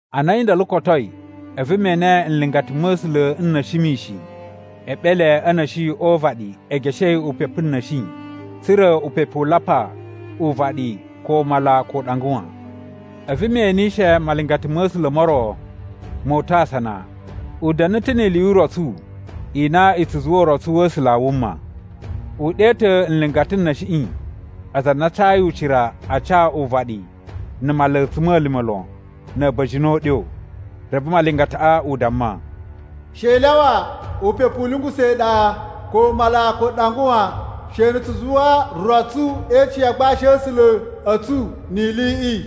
Ana a̱yi ndolo kotoi, a̱vu me ene nlingata ma̱ A̱sula̱ n na̱shi mishin e eɓele a̱ na̱shi o uvaɗi e geshei upepu na̱shi tsa̱ra̱ upepu u lapa uvaɗi ko mala ko uɗanga wan. A̱vu me enishe malingata ma̱ A̱sula̱ mo ro mo uta̱ asana, u da̱na̱ ta̱ ni ili yu urotsu i na i tsu zuwa urotsu wa̱ A̱sula̱ a wuma. U ɗe ta̱ nlingata n na̱shiꞌi aza a na a cayi ucira a ca uvaɗi na̱ mala a̱tsuma̱lima̱ lon na̱ a̱ba̱jini o uɗyo. Reve malingataꞌa u damma, “She i lyawa upepu u lungusa̱ iɗa, ko mala, ko uɗanga wan, she na̱ tsu zuwa rotsu e icin ya agbashi a̱ A̱sula̱ a̱ tsu ni iliꞌi.”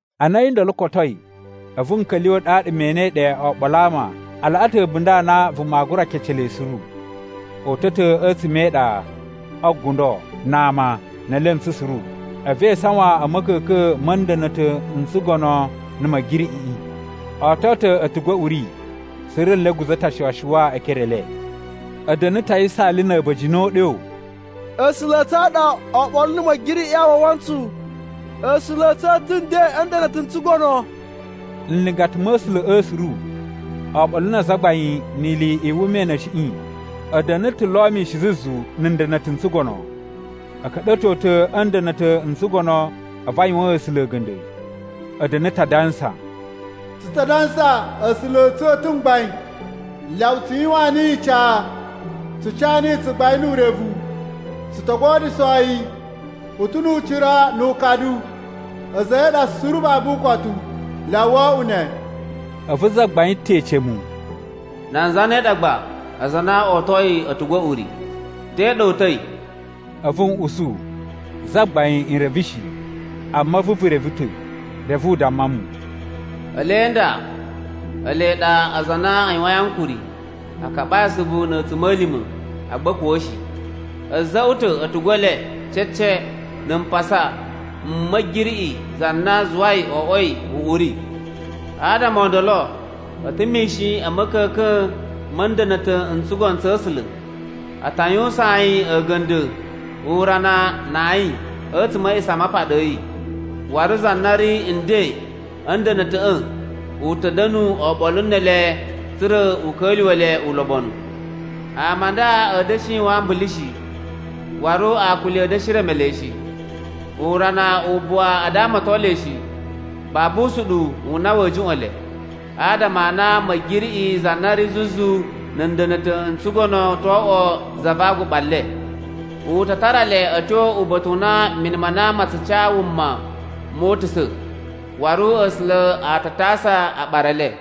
Ana a̱yi ndolo kotoi, a̱vu n ka̱lyuwa̱ ɗaɗa me enei ɗe oɓolo a ama a laꞌa ta̱ a̱bunda̱ a na vuma aa gura kece le suru. O uta̱ ta̱ a̱tsuma̱ e iɗa, o gundo, na ama, ne elentsu suru, a̱vu e isawan a̱ ma̱ka̱ka̱n ma̱ nda̱na̱ta̱ n tsugono na̱ Ma̱giriꞌiꞌi. O oto ta̱ a̱tugu a̱ uri, suru nle a̱ guza̱ ta̱ ashuwa-shuwa e ekere e le. A̱ da̱na̱ ta̱ a yisaali na̱ a̱ba̱jini o uɗyo, “A̱sula̱ a̱ tsu a ɗa oɓolo na̱ Ma̱giriꞌiꞌi a wawa ntsu, A̱sula̱ a̱ tsu u ta̱ nden a̱ nda̱na̱ta̱ n tsugono.” Nlingata ma̱ A̱sula̱ꞌa̱ suru oɓolo na azagbain ni ili i wuma i na̱shiꞌi a̱ da̱na̱ ta̱ lo mishin zuzu na̱ nda̱na̱ta̱ n tsugono. A̱ ka̱ɗa̱to ta̱ a̱ nda̱na̱ta̱ n tsugono a̱vu a yuwaan A̱sula̱ a̱ga̱nda̱. A̱ da̱na̱ ta̱ adansa, “Tsu ta dansa A̱sula̱ a̱ tsu a̱ ta̱ mgbain, Lyawa tsu yuwaan niyi ica, tsu ca niyi tsugbain nu urevu, tsu to godyusho yi, u ta̱ nu ucira nu ukadu, a̱za̱ a̱ yi a ɗa suru babu ukotu. Lyawa wo oꞌwo ne!” A̱vu zagbain ta̱ ece mu, “Nan zane ɗa gba aza a na o otoi a̱tugu a̱ uri? Te ɗa o uta̱i?” A̱vu n usu, “Zagbain, n reve shi, amma a̱vu vu reve ta̱.” Reve u damma mu, “Ele nda ele ɗa aza a na a yuwain ankuri a kaɓai asuvu na̱ a̱tsuma̱lima̱ agba a̱ kuwa̱ shi. A̱ za̱ꞌwa̱ ta̱ a̱tugu e le cece na̱ mpasa m Ma̱giriꞌi za na zuwai o oꞌwoi uꞌuri. “Adama o ndolo a̱ ta̱ mishin a̱ ma̱ka̱ka̱n ma̱ nda̱na̱ta̱ n tsugono tsa̱ A̱sula̱. A ta yuwusaan yi a̱ga̱nda̱ urana na ayin a̱tsuma̱ a̱ A̱a̱ꞌisamapaɗa a̱ yi. Waru za na ri nden a̱ nda̱na̱ta̱ꞌa̱ u ta̱ da̱nu oɓolo ne ele tsa̱ra̱ u ka̱lyuwa̱ le ulobonu. “Ama a nda a̱a̱ da̱shi yuwan ambulu shi, waru akuli a̱a̱ da̱shi reme le shi. Urana u buwa a damaton le shi, babu usuɗuwu u na wa̱a̱ juꞌwa̱n le, adama a na Ma̱giriꞌi za na ri zuzu na̱ nda̱na̱ta̱ n tsugono to oꞌwo za va aguɓa le. U ta tara le a̱ tyo uba̱ta̱ u na mini ma na ma tsu ca wuma moo utusa̱. Waru A̱sula̱ a ta tasa aɓara e le.”